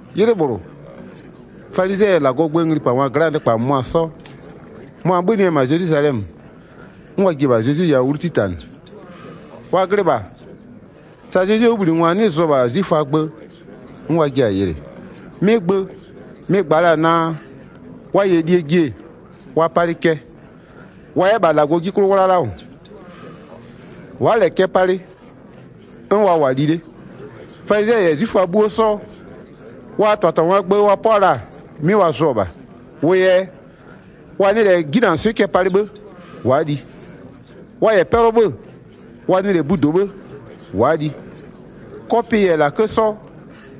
'Ylɩ -bhlʋ, falizɩɛ -yɛ -Lagɔɔ gböö nglipangwa gla'aa nɩkpa -mʋmʋa 'sɔ, mʋa-a 'bhönɩ-ɛ -ma Zelwizalɛmö, 'n wa ji-e -bha Zezwi yawʋ 'wlu 'titanɩ. Wa glɩ -bha, sa Zezwie 'wʋbhlinɩngwa 'nɩ zʋ-ɔ -bha 'zwiföaa gbö, 'n wa jiɩ-a yɩlɩ. 'Mɩ gbö mɩ-ɩ gba la-a naa, wa -yɛ lie ji-e, wa palɩ cɛ, wa 'yɛ -bha -Lagɔɔ 'ji 'klʋ 'wlala -wʋ. Wa'a -lɛ -nɩ cɛ palɩ, 'n wa -wʋ-a li 'le. Falizɩɛ -yɛ 'zwiföa 'bhuo 'sɔ, wa -tɩbhatɩbhangwaa gbö wa 'pʋa la-a 'mɩ wa zʋ-ɔ -bha. Wʋ yɛ wa nɩ -lɛ 'jinanɩswɩ'ɩ cɛ palɩ 'bhë wa'a li. Wa -yɛ 'yɛ 'pɛlʋ 'wʋ 'bhö-ö, wa nɩ -lɛ budo 'bhë wa'a li. 'Kɔpɩ -yɛ -lakë 'sɔ,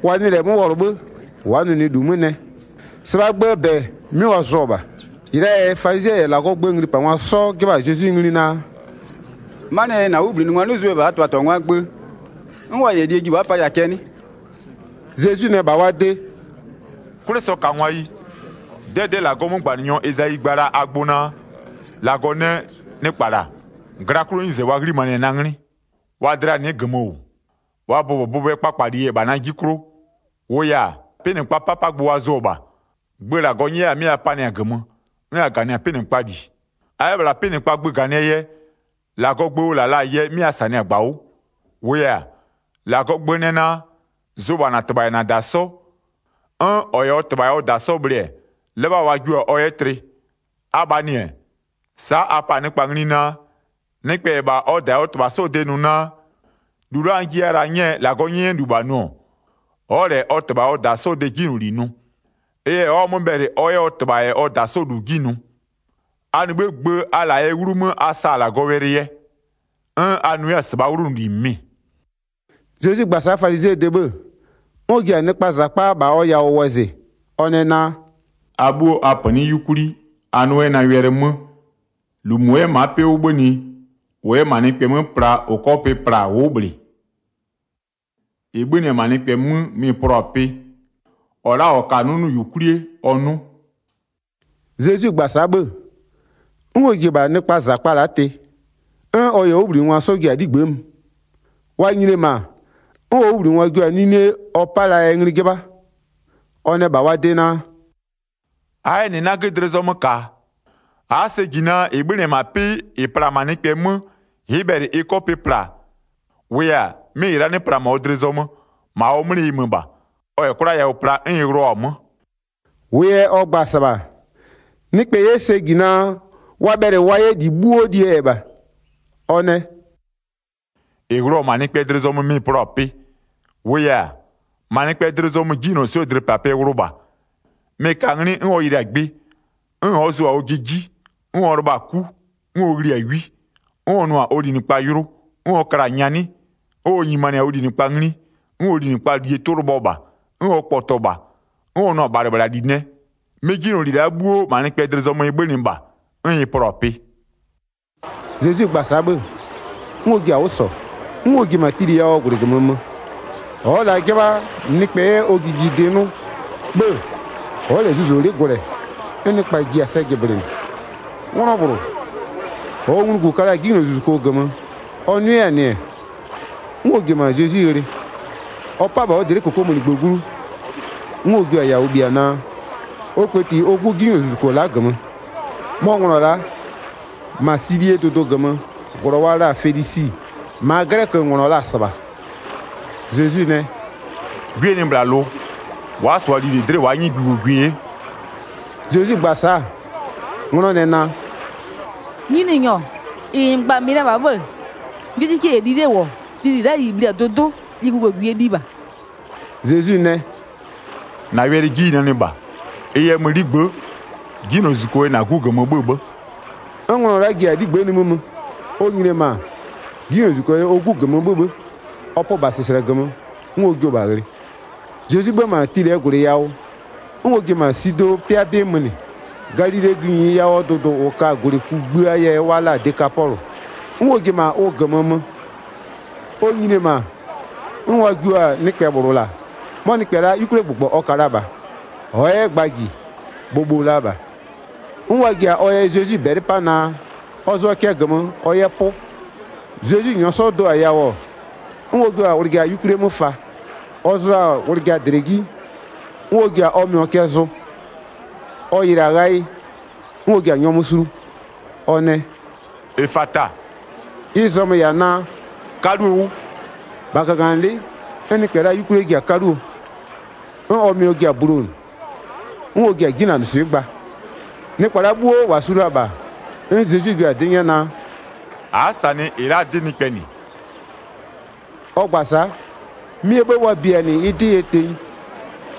wa nɩɩ -lɛ 'mö wɔlʋ 'bhë, wa'a nʋnʋɩ -lu 'mö nɛ. -Sɩbhaa gböö -bɛ 'mɩ wa zʋ-ɔ -bha. 5-Ɩ la'aa yɛ falizɩɛ -yɛ -Lagɔɔ gböö nglipangwa 'sɔ 'jɩbha-a Zezwi ngli naa: “'Manɩɛ yɛ -na 'wʋbhlinɩngwa 'nɩ zʋ bhe -bha -aa -tɩbhatɩbhangwaa gbö, 'n wa -yɛ lie ji wa'a palɩ-a cɛ 'nɩ?” Zezwi nɛ -bha wa de: “'Kwlɩsɔkangwayi, 'dɛdɛ'ɛ -Lagɔɔ 'mögbanɩnyɔ Ezayi gba la-a a gbʋ naa: -Lagɔ nɛ: Nɩkpa -la, gla 'klʋɔ 'nyize wa 'ghlimanɩ-ɛ na 'nglɩ, wa dlɩa nɩ'ɩ -gömö -wʋ. Wa bʋbɔbʋbʋɛ kpakpaleyi-e -bha na 'ji 'klʋ. -Wʋʋ yɛ-a, 'pɩnɩkpaa 'papagbö wa zʋ-ɔ -bha. Gbö -Lagɔ 'nyɛya la-a 'mɩ a panɩ-a -gömö, 'n a -ganɩ-a 'pɩnɩkpaa -li. A 'yɛ -bhla 'pɩnɩkpaa gbö -ganɩɛ yɛ, -Lagɔɔ gbö ʋ -la la-a yɛ 'mɩ a -sanɩ-a -gbawʋ. 10-Wʋʋ yɛ-a, -Lagɔɔ gbö nɛ naa: Zʋ -bha -na -tɩbha -yɛ -na -da 'sɔ, 'n -ɔ -yɛ ɔ -tɩbha -yɛ ɔ -da 'sɔ bhlɩ-ɛ, 'lɩbha wa jio-a ɔ 'yɛ tlɩ. Abhaa -nɩ-ɛ, sa'a a pa-a nɩkpa ngli naa, nɩkpɛ -yɛ -bha ɔ -da -yɛ ɔ -tɩbha 'sɔɔ de nʋ naa, -lu la'a n jiya la-a 'nyɛɛ -Lagɔɔ 'nyɛnyɛlu -bha nʋ-ɔ, ɔ'ɔ -lɛ ɔ -tɩbha -yɛ ɔ -da 'sɔɔ de 'jinyloli nʋ. Ɩ yɛ ɔ'ɔ-a 'mö bhɛlɩ ɔ 'yɛ ɔ -tɩbha -yɛ ɔ -da 'sɔ -lu 'ji nʋ. A -nɩ 'bhïë gbö a -la-a yɛɛ 'wlumö a sa-a -Lagɔwɛlɩ yɛ. 'N a nʋ 'yɛ-a -sɩbhaa 'wlʋnʋli -mɩmɩ.” Zezwi gba-a sa'a falizɩɛɛ de 'bhë-ë, 'n ɔ ji-a nɩkpaa -zakpa -bha ɔ yawʋ wɔzɩ, ɔ nɛ naa: “A 'bhuo a -pönɩ'ɩ 'yukwli, a 'nʋ 'yɛ na wɛlɩ 'mö. 15-Lu -mʋ 'yɛ-ɛ ma'a 'pɩ 'bhönɩ, -ʋ 'yɛ -ma nɩkpɛ 'mö pla -ʋ 'kɔ pɩ pla-a ʋ'ʋ -bhlɩ. -Ɩ 'bhönɩ-ɛ -ma nɩkpɛ 'mö mɩ-ɩ plɔ-a pɩ. [ 16-Ɔ la'a -ɔ ka-a 'nʋnʋyukwlie ɔ 'nʋ.”] Zezwi gba-a sa'a 'bhë-ë, 'n ɔ ji-e -bha nɩkpaa -zakpa la'a tɩ, 'n ɔ -yɛ ɔ 'wʋbhlinɩngwa 'sɔ ji-a 'ligbë'ë mö. Wa nyini-e -ma, 'n ɔ 'wʋbhlinɩngwa jio-a 'nine ɔ 'pa la-aa yɛ ngli 'jɩbha. Ɔ nɛ -bha wa de naa: “A'a 'yɛ -nɩ 'nagö dlɩ zɔmö -ka-a? A'a sɛ -ji naa -ɩ la'a -ɩ 'bhönɩ-ɛ -ma 'pɩ -ɩ pla-a nɩkpɛ 'mö ɩ'ɩ bhɛlɩ ɩ 'kɔ pɩ pla-a? 19-Wʋʋ yɛ-a, 'mɩ -ɩ la'a 'nɩ pla -ma ɔ dlɩ zɔmö, -ma ɔ 'mlɩ ɩ mö -bha. Ɔ -yɛ 'kwla yawʋ pla 'n ɩ wlʋɔ-a 'mö.” -Wʋʋ yɛ ɔ gba-a -sɩbha, nɩkpɛ 'yɛ sɛ -ji naa, wa bhɛlɩ wa 'yɛ lili 'bhuo lie yɛ -bha. Ɔ nɛ: “-Ɩ wlʋ-ɔ -ma nɩkpɛɛ dlɩ zɔmö, mɩ-ɩ plɔ-a pɩ. 21-22-Wʋʋ yɛ-a, -ma nɩkpɛɛ dlɩ zɔmö 'jinylɔswɩ'ɩɛ dlɩpapɩɛ wlʋ -bha, mɩ-ɩ ka-a 'nglɩ 'n ɔ yɩlɩ-a gbɩ, 'n ɔ'ɔ zʋ-a ɔjɩ 'ji, 'n ɔ lɩbha-a 'ku, 'n ɔ ghli-a 'wi, 'n ɔ nʋ-a ɔ linɩkpa yʋlʋ, 'n ɔ kla-a nyanɩ, 'n ɔ nyimanɩ-a ɔ linɩkpa ngli, 'n ɔ linɩkpaa -lie 'tʋ lɩbhɔ -bha, 'n ɔ kpɔtɔ -bha, 'n ɔ nʋ-a -bhalɩbhlali nɛ. 'Mɩ 'jinyloli la'a 'bhuo -ma nɩkpɛɛ dlɩ zɔmö ɩ 'bhönɩ -bha, 'n ɩ plɔ-a pɩ.” Zezwi gba-a sa'a bhë-ë, 'n ɔ ji-a 'wʋ -sɔ, 'n ɔ ji-e -ma Tilɩ yawʋɔ -gwlɩ -gömö mö. Ɔ'ɔ la 'jɩbha nɩkpɛ 'yɛ ɔ jijidɩ 'nʋ, 'bhë ɔ'ɔ -lɛ zuzolɩ'ɩ gwlɛ 'n nɩkpa ji-a sɛ jɩblɩnɩ. 'Nglɔ -bhlʋ -ɔɔ nglugu ka la-a 'jinylozuzuko -gömö ɔ 'nʋ 'yɛ-a -nɩ, 'n ɔ ji-e -ma Zezwi ghlɩ. Ɔ 'pa-a -bha ɔ dlɩ'ɩ -kokomunigbö glu, 'n ɔ jio-a yawʋ bhia naa, ɔ kpëti ɔ 'gu 'jinylozuzuko la'a -gömö. 'Mɔ nglɔ la'a, -ma Silie dʋdʋ -gömöö -glɔ wa la-a Fenisi, -maa 'glɛkönglɔ la-a -sɩbha. Zezwi nɛ: “'Gwie nɩ -bhla lʋ, wa'a -sʋa lili dlɩ'ɩ wa'a 'nyɩ gʋgogwie 'ye.” Zezwi gba-a sa'a, 'nglɔ nɛ naa: “Nyininyɔ, -ɩ -n gba-a mɩ la -bha 'bhë-ë, 'gwiekikie -yɛ li 'le -wʋ, lili la'a -ɩ bhli-a dʋdʋ'ʋ, li gʋgogwie liɩ -bha.” Zezwi nɛ: “-Na wɛlɩ 'ji ɩ nanɩ -bha. Ɩ yɛ mö 'ligbë'ë, 'jinylozuzuko yɛ -na 'gu -gömö 'bhö-ö 'bhë.” 'N nglɔ la'a ji-a 'ligbë'ë nimï mö. Ɔ nyini-e -ma, 'jinylozuzuko yɛ ɔ 'gu -gömö 'bhö-ö 'bhë, ɔ pö -bha -sɩslɛ -gömö 'n ɔ jio-o -bha ghlɩ. Zezwi 'bhö-ö -ma Tilɩɛ -gwlɩ yawʋ, 'n ɔ ji-e -ma Sidɔɔ 'pɩa 'bɩ mönɩ, Galilee gïnyi yawʋɔ dʋdʋ -ʋ ka-a -gwlɩ kugbïaa yɛ wa la-a Dekapɔlʋ, 'n ɔ ji-e -ma ʋ -gömö mö. Ɔ nyini-e -ma, 'n wa jio-a nɩkpɛ -bhlʋ -la. 'Mɔ nɩkpɛ la'a 'yukwliagbʋgbɔ ɔ ka la -bha, ɔ'ɔ 'yɛ gba -ji, bhobho la -bha. 'N wa ji-a ɔ yɛ Zezwi -bɛlɩ 'pa naa, ɔ zʋɔ cɛ -gömö ɔ 'yɛ 'pʋ. Zezwi -nyɔɔ 'sɔ do-a yawʋ-ɔ, 'n ɔ jio-a wlɩja 'yukwli 'mö fa, ɔ zʋ-a wlɩja -dlɛ 'ji, 'n ɔ ji-a ɔ mɩɔ cɛ zʋ. Ɔ yɩlɩ-a ghayɩ, 'n ɔ ji-a nyɔmʋ sulu ɔ nɛ: “Efata!” Ɩ zɔmö-ö -yɛ-a naa: “'Kaluo 'wʋ.” 35-Bha -gaganɩlɩ'ɩ, 'n nɩkpɛ la'aa 'yukwlie ji-a 'kaluo, 'n ɔ mɩɔ ji-a bulonʋ. 'N ɔ ji-a 'jinanɩswɩ'ɩ gba. Nɩkpa la'a 'bhuo -wa su la-a -bha, 'n Zezwi jua-a 'dɩ 'nyɛ naa: “A'a -sanɩ -ɩ la'aa 'dɩ nɩkpɛ -nɩ.” Ɔ gba-a sa'a, 'mɩɛ 'bhë wa bia-a -nɩ ɩ 'dɩ yɛ tenyi.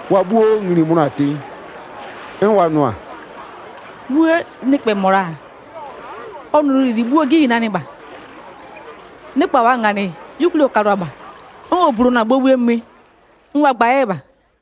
Wa 'bhuo ngli-i mönʋa-a tenyi, 'n wa nʋ-a: “'Wuë! Nɩkpɛ -mɔ -la, ɔ nɔnʋli 'bhuo 'ji ɩ nanɩ -bha. Nɩkpa -waa-a -nganɩ, 'yukwlie ɔ kalʋa -bha, 'n ɔ bulonʋ-a bhobhuo mwɩ 'n wa gba 'yɛ -bha.”